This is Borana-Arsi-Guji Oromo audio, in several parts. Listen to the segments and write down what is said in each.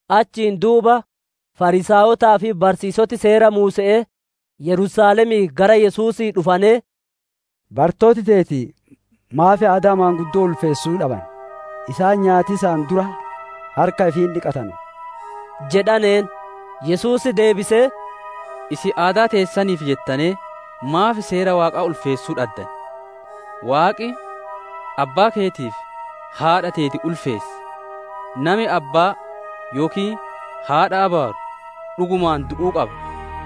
Achiin duuba Fariisaayotaa fi barsiisoti Seera Muuse'ee Yerusaalemii gara Yesuusii dhufanee, «Barattooti teeti maaf aadaa maanguddo'oo ulfeessuu dhaban? Isaan nyaatiisaan dura harka ifii hin dhiqatanu!» jedhaneen. Yesuus deebisee, «Isin aadaa teessaniif jettanee maaf Seera Waaqaa ulfeessuu dhaddan? Waaqi, ‹Abbaa keetii fi haadha teeti ulfeessi›, ‹Nami Abbaa yookiin haadhaa abaaru dhugumaan du'uu qaba›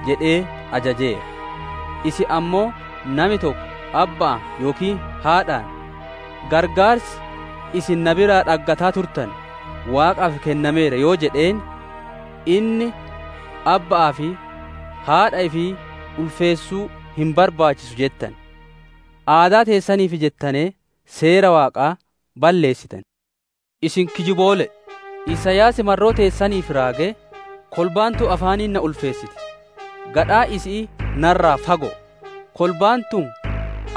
jedhee ajajeera. Isin ammoo nami tokko abba'aan yookiin haadhaan, ‹Qarqaarsi isin na biraa dhaggataa turtane Waaqaaf kennameera› yoo jedheen, inni ‹Abba'aa fi [haadha ifii] ulfeessuu hin barbaachisu› jettan, aadaa teessaniif jettanee, Seera Waaqaa balleessitan. Isin kijiboole'e! Isaayaas marroo teessaniif raagee, «‹Kolbaan tun afaaniin na ulfeessiti, gadhaan isi'ii narraa fago'o. Kolbaan tun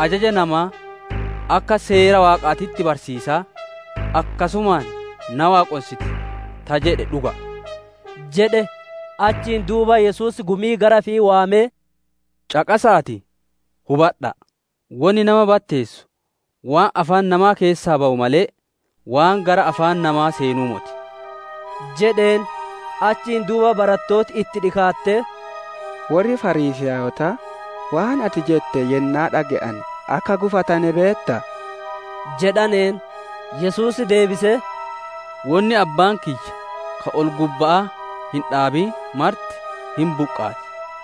ajaja namaa akka seera Waaqaatitti barsiisaa, akkasumaan na waaqonsiti› ta jedhe dhuga'a» jedhe. Achiin duuba Yesuus gumii gara ifii waamee, «Caqasa'aatii hubadha'a: wonni nama batteessu waan afaan namaa keessaa bawu malee, waan gara afaan namaa seenuu moti» jedheen. Achiin duuba barattooti itti dhikaattee, «Worri Fariisaayotaa waan ati jette yennaa dhage'ane akka gufatane beettaa?» jedhaneen. Yesuus deebisee, «Wonni Abbaan kiyya ka ol-gubba'aa hin dhaabin marti hin buqqaati.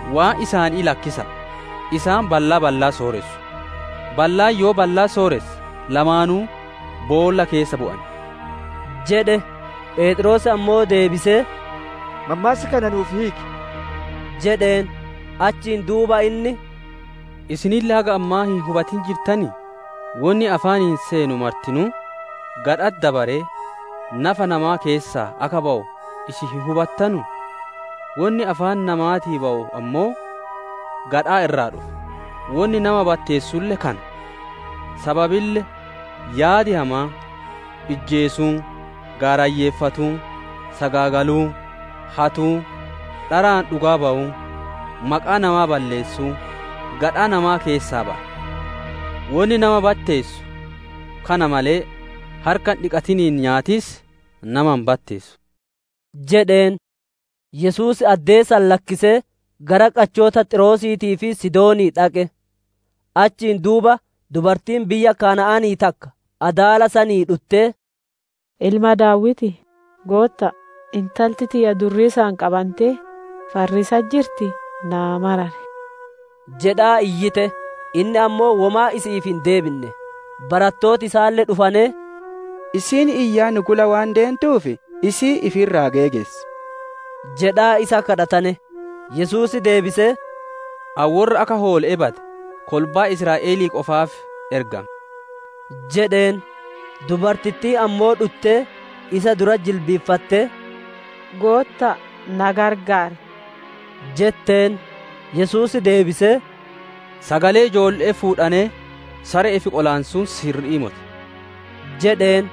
Waan isaanii lakkisa'a; isaan ballaa ballaa sooressu. Ballaan yoo ballaa sooresse, lamaanuu boolla keessa bu'an» jedhe. Pheexroos ammoo deebisee, «Mammaassa kana nuuf hiiki» jedheen. Achiin duuba inni, «Isinille haga ammaa hin hubatin jirtanii? Wonni afaaniin seenu martinuu, gadha'atti dabaree, nafa namaa keessaa akka bawu isin hin hubattanuu? Wonni afaan namaatii bawu ammoo gadhaa irraa dhufa, wonni nama batteessulle kana. Sababille Yaadi hamaan, ijjeesuun, gaarayyeeffatuun, sagaagaluun, hatuun, dharaan dhugaa bawuun, maqaa namaa balleessuun gadhaa namaa keessaa baya. Wonni nama batteessu kana malee, harka hin dhiqatiniin nyaatiis nama hin batteessu» jedheen. Yesuus addee san lakkisee gara qachoota Xiiroosiitii fi Sidoonii dhaqe. Achiin duuba dubartiin biyya Kana'aanii takka adaala sanii dhuttee, «Ilma Daawitii, Gootta'a! Intalti tiyya durriisaan qabantee farriisatti jirtii, naa marari» jedhaa iyyite. Inni ammoo womaa isi'iif hin deebinne. Barattooti isaalle dhufanee, «Isiin iyyaa nu gula waan deentuuf, isii ifi irraa geegessi!» jedhaa isa kadhatane. Yesuus deebisee, «Ani worra akka hoole'ee bade kolbaa Israa'elii qofaaf ergame» jedheen. Dubartittiin ammoo dhuttee isa duratti jilbiiffattee, «Gootta'a, na gargaar» jetteen. Yesuus deebisee, «Sagalee ijoolle'ee fuudhanee sare'eef qolaansuun sirri'ii moti» jedheen.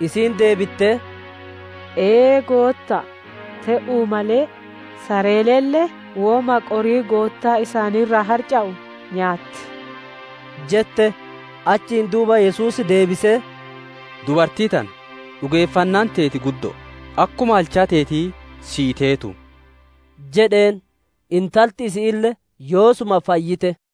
Isiin deebittee, «Ee, Gootta'a, te'uu malee sareelle woma qorii goottaa isaanii irraa harca'u nyaatti» jette. Achiin duuba Yesuus deebisee, «Dubartii tana, dhugeeffannaan teeti guddo'o! Akkuma halchaa teetii sii teetuu» jedheen. Intalti isi'iille yoosuma fayyite.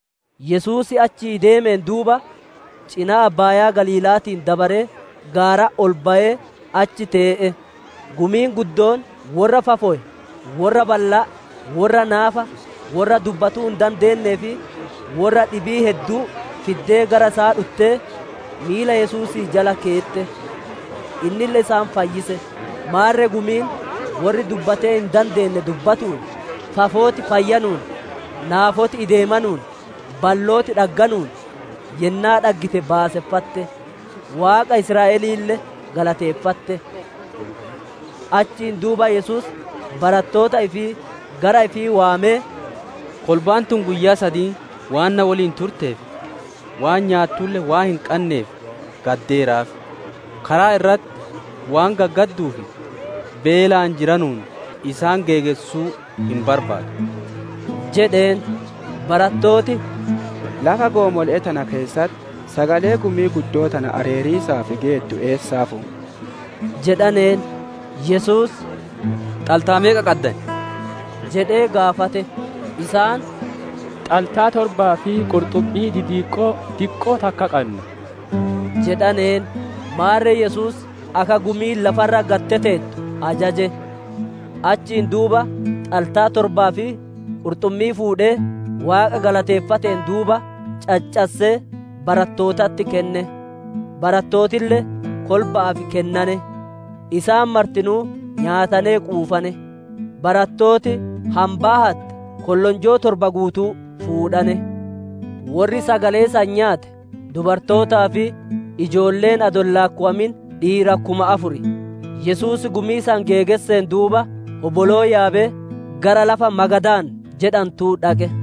Yesuus achii deemeen duuba, cinaa abbaayaa Galiila'aatiin dabaree, gaaratti ol bayee achi tee'e. Gumiin guddoon worra fafowe, worra ballaa, worra naafa, worra dubbatuu hin dandeennee fi worra dhibii hedduu fiddee gara isaa dhuttee, miila Yesuusii jala keette. Innille isaan fayyise. Maarre gumiin worri dubbatee hin dandeenne dubbatuun, fafooti fayyanuun, naafoti ideemanuun, ballooti dhagganuun yennaa dhaggite baaseffatte. Waaqa Israa'eliille galateeffatte. Achiin duuba Yesuus barattoota ifii gara ifii waamee, «Kolbaan tun guyyaa sadiin waan na woliin turteef, waan nyaattulle waan hin qanneef nayeeraaf; karaa irratti waan gaggadduuf, beelaan jiranuun isaan geegessuu hin barbaadu» jedheen. Barattooti, «Lafa goomole'ee tana keessatti sagalee gumii guddoo tana areeriisaaf geettu eessaa fuuna?» jedhaneen. Yesuus, «Xaltaa meeqa qaddan?» jedhee gaafate. Isaan, «Xaltaa torbaa fi qurxummii didiqqoo diqqoo takka qanna» jedhaneen. Maarre Yesuus akka gumiin lafa irra gad teteettu ajaje. Achiin duuba xaltaa torbaa fi qurxummii fuudhee, Waaqa galateeffateen duuba, caccassee barattootatti kenne; barattootille kolba'aaf kennane. Isaan martinuu nyaatanee quufane; barattooti hambaa hatte kollonjoo torba guutuu fuudhane. Worri sagalee san nyaate, dubartootaa fi ijoolleen adoo hin laakkowamin dhiira kuma afur. Yesuus gumii san geegesseen duuba, hoboloo yaabee gara lafa Magadaan jedhantu dhaqe.